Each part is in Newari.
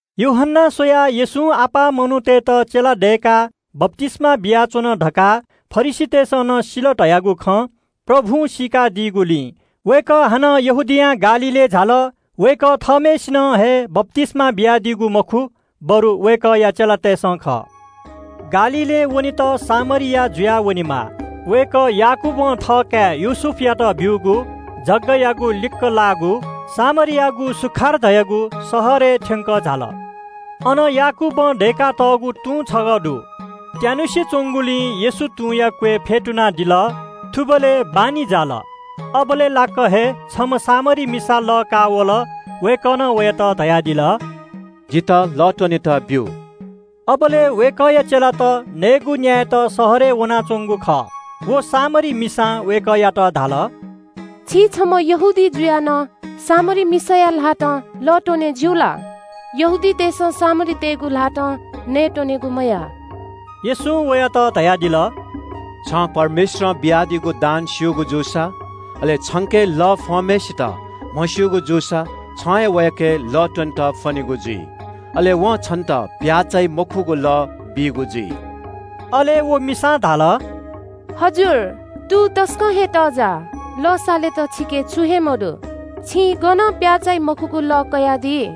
यूहन्‍नां स्‍वयाः येशूं यक्‍व मनूतय्‌त चेला दय्‌काः बप्‍तिस्‍मा बियाच्‍वन धकाः फरिसीतय्‌सं नं सिल धयागु खँ प्रभुं सीकादीगुलिं वय्‌कः हानं यहूदियां गालीलय् झाल। वय्‌कः थःम्‍हय्‌सिनं हे बप्‍तिस्‍मा बियादीगु ला मखु, बरु वय्‌कःया चेलातय्‌सं ब्‍यूगु खः। गालीलय् वनेत सामरिया जुयाः वनेमाः। वय्‌कः याकूबं थःकाय् योसेफयात ब्‍यूगु जगायागु लिक्‍क लाःगु सामरियायागु सुखार धाःगु शहरय् थ्‍यंकः झाल। अन याकूबं दय्‌कातःगु तुं छगः दु। त्‍यानुसे च्‍वंगुलिं येशू तुंया क्‍वय् फ्‍यतुनादिल। थुबलय् बान्‍हि जाल। अबलय् लाक्‍क हे छम्‍ह सामरी मिसा लः काःवल। वय्‌कलं वयात धयादिल – “जितः लः त्‍वनेत बियादिसँ।” अबलय् वय्‌कःया चेलात नयेगु नसा न्‍यायेत शहरय् वनाच्‍वंगु खः। सामरी मिसां वय्‌कःयात धाल – “छि छम्‍ह यहूदी जुयाः नं सामरी मिसाया ल्‍हातं लः त्‍वने ज्‍यू ला?” यहूदीतय्‌सं सामरीतय्‌गु ल्‍हातं नयेत्‍वनेगु मयाः। येशूं वयात धयादिल – “छं परमेश्‍वरं बियादीगु दान स्‍यूगु जूसा, अले छंके लः फ्‍वंम्‍हय्‌सित म्‍हस्‍यूगु जूसा, छं वयाके हे लः त्‍वनेत फ्‍वनीगु जुइ। अले वं हे छन्‍त जीवन दइगु लः बीगु जुइ।” अले व मिसां धाल – “हजुर, तुं तसकं हे तःजाः, लः सालेत छिके छुं हे मदु। छिं जीवन दइगु लः गनं कयादी?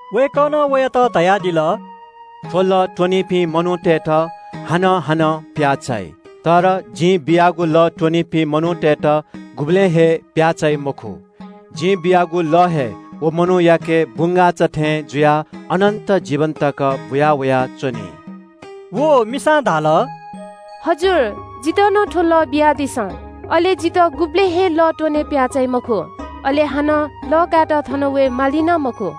वय्‌कलं वयात धयादिल – “थ्‍व लः त्‍वनीपिं मनूतय्‌त हानं हानं प्‍याः चाइ। तर जिं बियागु लः त्‍वनीपिं मनूतय्‌त गुबलें हे प्‍याः चाइ मखु। जिं बियागु लः हे व मनूयाके बुंगाःचा थें जुयाः अनन्‍त जीवन तक बुयावया च्‍वनी।” व मिसां धाल – “हजुर, जितः नं थ्‍व लः बियादिसँ। अले जितः गुबलें हे लः त्‍वने प्‍याः चाइ मखु। अले हानं लः कायेत थन वये माली नं मखु।”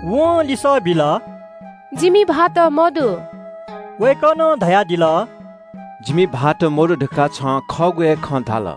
वं लिसः बिल – “जिमि भाःत मदु।” वय्‌कलं धयादिल – “जिमि भाःत मदु धकाः छं खःगु हे खँ धाल।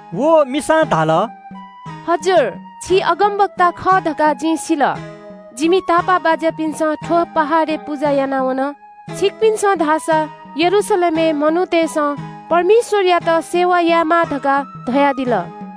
व मिसां धाल – “प्रभु, छि अगमवक्ता खः धकाः जिं सिल। जिमि तापाःबाज्‍यापिन्‍सं थ्‍व पहाडय् पुजा याना वन, छिकपिन्‍सं धाःसा यरूशलेमय् मनूतय्‌सं परमेश्‍वरयात आराधना यायेमाः धकाः धयादिल।”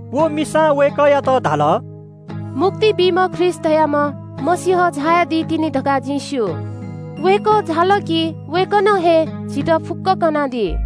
व मिसां वय्‌कःयात धाल – “मुक्ति बीम्‍ह ख्रीष्‍ट धाःम्‍ह मसीह झायादी तिनि धकाः जिं स्‍यू। वय्‌कः झाल कि वय्‌कलं हे झीत फुक्‍कं खँ कनादी।”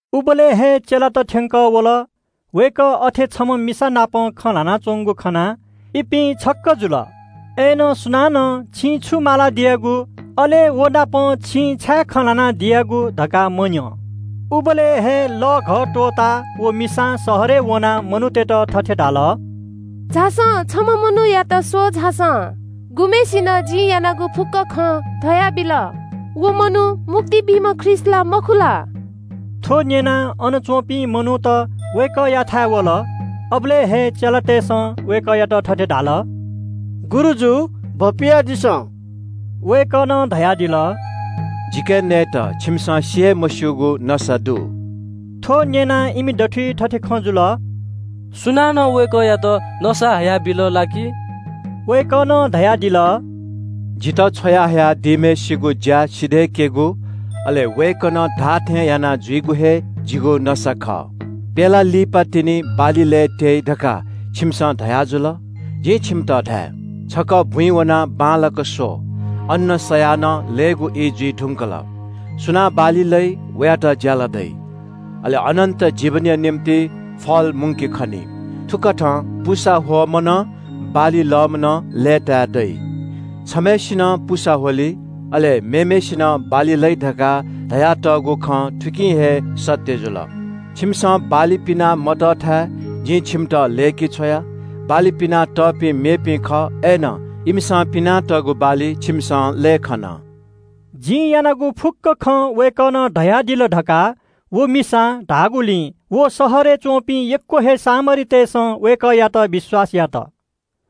उबलय् हे चेलात थ्‍यंकः वल। वय्‌कः अथे छम्‍ह मिसानाप खँ ल्‍हानाच्‍वंगु खनाः इपिं छक्‍क जुल। अय्‌नं सुनानं – “छिं छु मालादियागु” अले “व नाप छिं छाय् खँ ल्‍हानादियागु?” धकाः मन्‍यं। उबलय् हे लःघः त्‍वःताः व मिसां शहरय् वनाः मनूतय्‌त थथे धाल – “वा, छम्‍ह मनूयात स्‍वः वा। वय्‌कलं जिं यानागु फुक्‍क खँ धयाबिल। व मनू मुक्ति बीम्‍ह ख्रीष्‍ट ला, मखु ला?” थ्‍व न्‍यनाः अनच्‍वंपिं मनूत वय्‌कःयाथाय् वल। अबलय् हे चेलातय्‌सं वय्‌कःयात थथे धाल – “गुरुजु, भपियादिसँ।” वय्‌कलं धयादिल – “जिके नयेत छिमिसं सि हे मस्‍यूगु नसा दु।” थ्‍व न्‍यनाः इमि दथुइ थथे खँ जुल – “सुनानं वय्‌कःयात नसा हयाबिल ला कि छु?” वय्‌कलं धयादिल – “जितः छ्वयाहया दीम्‍हय्‌सिगु ज्‍या सिधय्‌केगु, अले वय्‌कलं धाःथें यानाजुइगु हे जिगु नसा खः। ‘प्‍यला लिपातिनि बाली लये त्‍यइ’ धकाः छिमिसं धयाजुल। जिं छिमित धाये – ‘छकः बुँइ वनाः बांलाक स्‍व, अन्‍न सयाः नं लयेगु ई जुइ धुंकल।’ सुनां बाली लइ, वयात ज्‍याला दइ, अले अनन्‍त जीवनया निंतिं फल मुंके खनी। थुकथं पुसा ह्वःम्‍ह नं, बाली लःम्‍ह नं लय्‌ताय् दइ। छम्‍हय्‌सिनं पुसा ह्वली, अले मेम्‍हय्‌सिनं बाली लइ धकाः धयातःगु खँ थुकिं हे सत्‍य जुल। छिमिसं बाली पिना मतःथाय् जिं छिमित लय्‌के छ्वया। बाली पिना तःपिं मेपिं खः, अय्‌नं इमिसं पिनातःगु बाली छिमिसं लये खन।” “जिं यानागु फुक्‍क खँ वय्‌कलं धयादिल” धकाः व मिसां धाःगुलिं व शहरय् च्‍वंपिं यक्‍व हे सामरीतय्‌सं वय्‌कःयात विश्‍वास यात।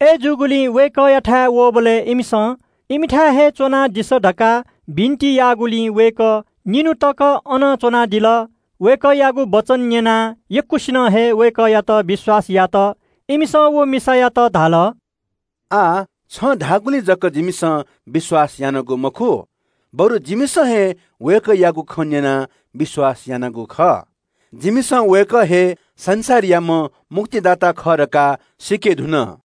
अय्‌जूगुलिं वय्‌कःयाथाय् वःबलय् इमिसं इमिथाय् हे च्‍वनादिसँ धकाः बिन्‍ति याःगुलिं वय्‌कः निन्‍हु तक अन च्‍वनादिल। वय्‌कःयागु वचन न्‍यनाः यक्‍वसिनं हे वय्‌कःयात विश्‍वास यात। इमिसं व मिसायात धाल – “आः छं धाःगुलिं जक जिमिसं विश्‍वास यानागु मखु, बरु जिमिसं हे वय्‌कःयागु खँ न्‍यनाः विश्‍वास यानागु खः। जिमिसं वय्‌कः हे संसारयाम्‍ह मुक्तिदाता खः धकाः सीके धुन।”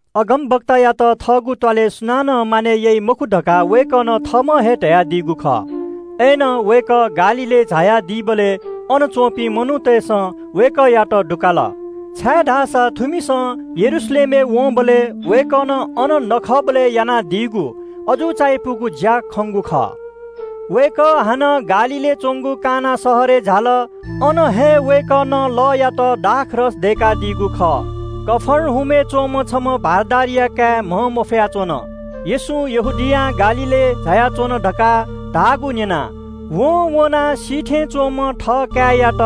अगमवक्तायात थःगु थासय् सुनानं मानय् याइ मखु धकाः वय्‌कलं थःम्‍हं हे धयादीगु खः। अय्‌नं वय्‌कः गालीलय् झायादीबलय् अन च्‍वंपिं मनूतय्‌सं वय्‌कःयात लसकुस यात, छाय्‌धाःसा थुमिसं यरूशलेमय् वंबलय् वय्‌कलं अन नखःबलय् यानादीगु अजू चायापुगु ज्‍या खंगु खः। वय्‌कः हानं गालीलय् च्‍वंगु काना शहरय् झाल। अन हे वय्‌कलं लःयात दाखमद्य दय्‌कादीगु खः। कफर्नहुमय् च्‍वंम्‍ह छम्‍ह भारदारया काय् म्‍हंमफया च्‍वन। येशू यहूदियां गालीलय् झायाच्‍वन धकाः धाःगु न्‍यनाः वं वनाः सी थें च्‍वंम्‍ह थःकाय्‌यात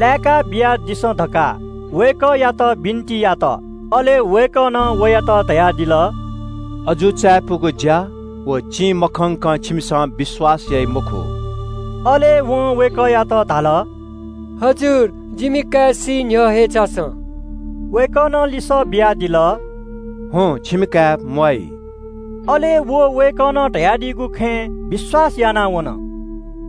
लाय्‌का बियादिसँ धकाः वय्‌कःयात बिन्‍ति यात। अले वय्‌कलं वयात धयादिल – “अजू चायापुगु ज्‍या व चिं मखंकं छिकपिन्‍सं विश्‍वास यानादी मखु।” अले वं वय्‌कःयात धाल – “प्रभु, जिमि काय् सी न्‍ह्यः हे झासँ।” वय्‌कलं लिसः बियादिल – “हुँ, छिमि काय् मसीनि।” अले व वय्‌कलं धयादीगु खँय् विश्‍वास यानाः वन।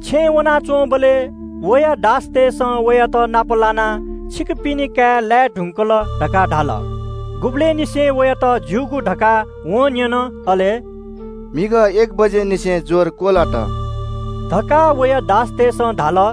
छेँय् वनाच्‍वंबलय् वया दासतय्‌सं वयात नाप लानाः “छिकपिनि काय् लाये धुंकल” धकाः धाल। गुबलय् निसें वयात ज्‍यूगु धकाः वं न्‍यन। अले “म्‍हिगः न्‍हिनय् एक बजेनिसें ज्‍वर क्‍वलात” धकाः वया दासतय्‌सं धाल।